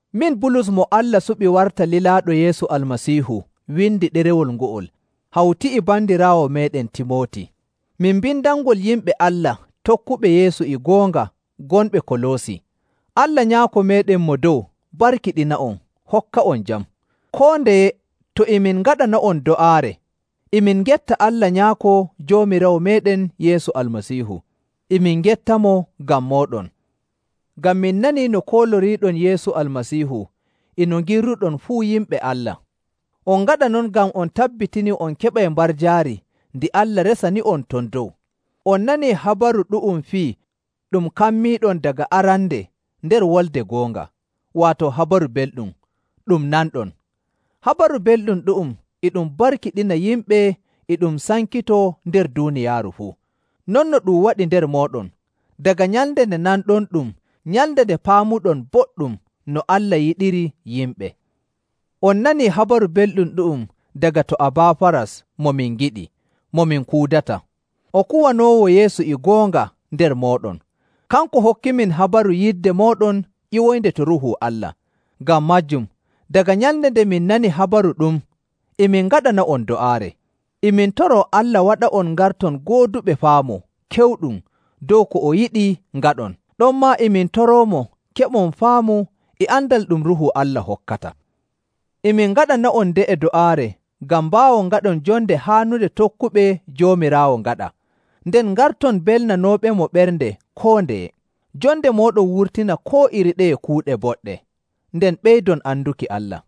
Min Bulus mo Allah suɓi warta lilaaɗo Yeesu Almasiihu windi ɗerewol ngo'ol hawti e bandiraawo meeɗen Timooti. Min mbindanngol yimɓe Allah tokkuɓe Yeesu e goonga gonɓe Koloosi. Allah Nyaako meeɗen Mo Dow barkiɗina'on hokka'on jam. Koo ndeye to e min ngaɗana'on do'aare e min ngetta Allah Nyaako Joomiraawo meeɗen Yeesu Almasiihu. E min ngettamo ngam mooɗon, ngam min nanii no kooloriiɗon Yeesu Almasiihu e no ngirruɗon fuu yimɓe Allah. On ngaɗa non ngam on tabbitinii on keɓay mbarjaari ndi Allah resani'on ton dow. On nanii habaru ɗu'um fii ɗum kammiiɗon daga arande nder wolde goonga, waato Habaru Belɗum ɗum nanɗon. Habaru Belɗum ɗu'um e ɗum barkiɗina yimɓe e ɗum sankitoo nder duuniyaaru fuu, non no ɗum waɗi nder mooɗon, daga nyalnde nde nanɗonɗum nyalnde nde paamuɗon boɗɗum no Allah yiɗiri yimɓe. On nanii Habaru Belɗum ɗu'um daga to Abaafaras mo min ngiɗi, mo min kuudata. O kuwanoowo Yeesu e goonga nder mooɗon. Kanko hokkimin habaru yidde mooɗon ƴiwoynde to Ruuhu Allah. Ngam maajum, daga nyalnde nde min nani habaru ɗum e min ngaɗana'on do'aare. E min toroo Allah waɗa'on ngarton gooduɓe faamu kewɗum dow ko o yiɗi ngaɗon. Ɗonmaa e min toroomo keɓon faamu e andal ɗum Ruuhu Allah hokkata. E min ngaɗana'on nde'e do'aare ngam mbaawon ngaɗon jonde haanunde tokkuɓe Joomiraawo ngaɗa, nden ngarton belnanooɓemo ɓernde koo ndeye, jonde mooɗon wurtina koo iri ɗeye kuuɗe boɗɗe, nden ɓeydon anduki Allah.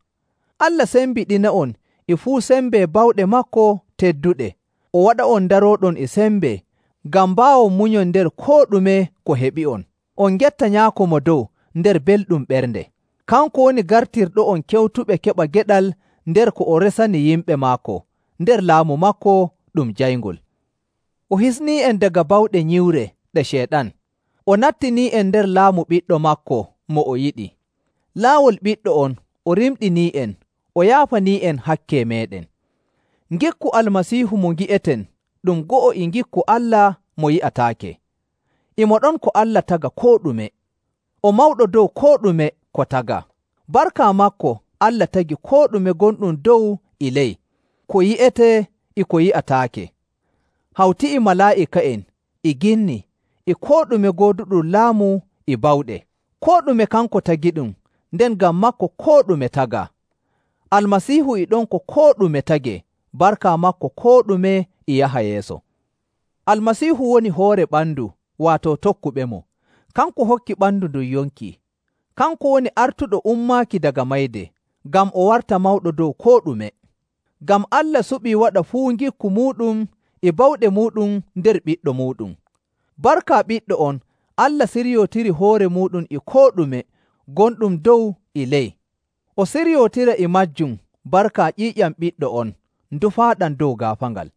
Allah sembiɗina'on e fuu sembe bawɗe maako tedduɗe, o waɗa'on ndarooɗon e sembe ngam mbaawon munyon nder koo ɗume ko heɓi'on, on ngetta Nyaako Mo Dow nder belɗum ɓernde. Kanko woni gartirɗo'on kewtuɓe keɓa geɗal nder ko o resani yimɓe maako nder laamu maako ɗum jayngol. O hisnii'en daga bawɗe nyiwre ɗe Ceyɗan, o nattinii'en nder laamu Ɓiɗɗo maako mo o yiɗi. Laawol Ɓiɗɗo on o rimɗinii'en o yaafanii'en hakke meeɗen.. Ngikku Almasiihu mo ngi'eten ɗum go'o e ngikku Allah mo yi'ataake. E mo ɗon ko Allah taga koo ɗume, o mawɗo dow koo ɗume ko tagaa. Barka maako Allah tagi koo ɗume gonɗum dow e ley, ko yi'etee e ko yi'ataake, hawti e malaa'ika'en, e ginni, e koo ɗume gooduɗum laamu e bawɗe. Koo ɗume kanko tagiɗum, nden ngam maako koo ɗume tagaa. Almasiihu e ɗon ko koo ɗume tagee, barka maako koo ɗume e yaha yeeso. Almasiihu woni hoore ɓandu, waato tokkuɓemo. Kanko hokki ɓandu ndun yonki. Kanko woni artuɗo ummaaki daga mayde, ngam o warta mawɗo dow koo ɗume.. Ngam Allah suɓii waɗa fuu ngikku muuɗum e bawɗe muuɗum nder Ɓiɗɗo muuɗum. Barka Ɓiɗɗo on Allah siryootiri hoore muuɗum e koo ɗume gonɗum dow e ley. O siryootira e maajum barka ƴiiƴam Ɓiɗɗo on ndufaaɗam dow gaafaangal..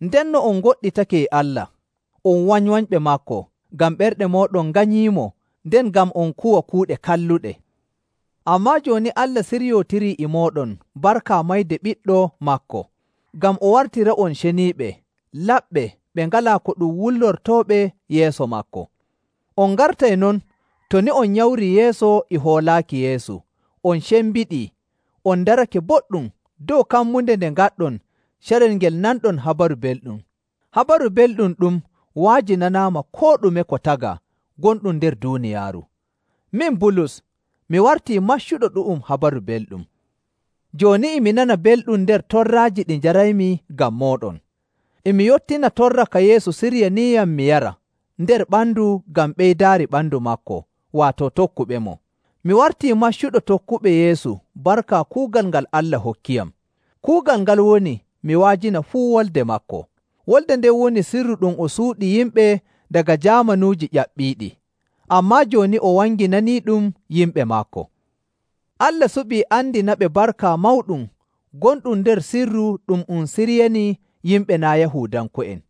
Ndenno on ngoɗɗitake Allah, on wanywanyɓe maako ngam ɓerɗe mooɗon nganyiimo nden ngam on kuwa kuuɗe kalluɗe. Ammaa jooni Allah siryootiri e mooɗon barka mayde Ɓiɗɗo maako, ngam o wartira'on ceniiɓe, laɓɓe ɓe ngalaa ko ɗum wullortooɓe yeeso maako. On ngartay non to nii on nyamrii yeeso e hoolaaki Yeesu, on cembiɗii, on darake boɗɗum dow kammunde nde ngaɗɗon carel ngel nanɗon Habaru Belɗum. Habaru Belɗum ɗum wa'ajinanaama koo ɗume ko tagaa gonɗum nder duuniyaaru. Min Bulus, mi wartii maccuɗo ɗu'um Habaru Belɗum. Jooni e mi nana belɗum nder torraaji ɗi njaraymi ngam mooɗon. E mi yottina torra ka Yeesu siryaniiyam mi yara nder ɓandu ngam ɓeydaari ɓandu maako, waato tokkuɓemo. Mi wartii maccuɗo tokkuɓe Yeesu barka kuugal ngal Allah hokkiyam. Kuugal ngal woni mi wa'ajina fuu wolde maako. Wolde nden woni sirru ɗum o suuɗi yimɓe daga jaamanuuji ƴaɓɓiiɗi, ammaa jooni o wanginaniiɗum yimɓe maako. Allah suɓii andinaɓe barka mawɗum gonɗum nder sirru ɗu'um ɗum o siryanii yimɓe naa' Yahuudanko'en.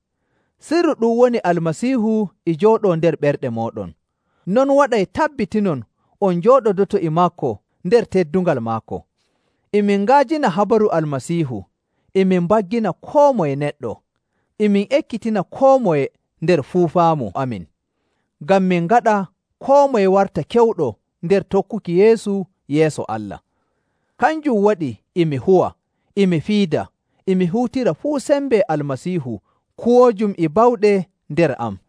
Sirru ɗum woni Almasiihu e jooɗoo nder ɓerɗe mooɗon, non waɗay tabbitinon on njooɗodoto e maako nder teddungal maako. E min nga'ajina habaru Almasiihu, e min mbaggina koo moye neɗɗo, e min ekkitina koo moye nder fuu faamu amin, ngam min ngaɗa koo moye warta kewɗo nder tokkuki Yeesu yeeso Allah. Kanjum waɗi e mi huwa, e mi fiida, e mi huutira fuu sembe Almasiihu kuwoojum e bawɗe nder am.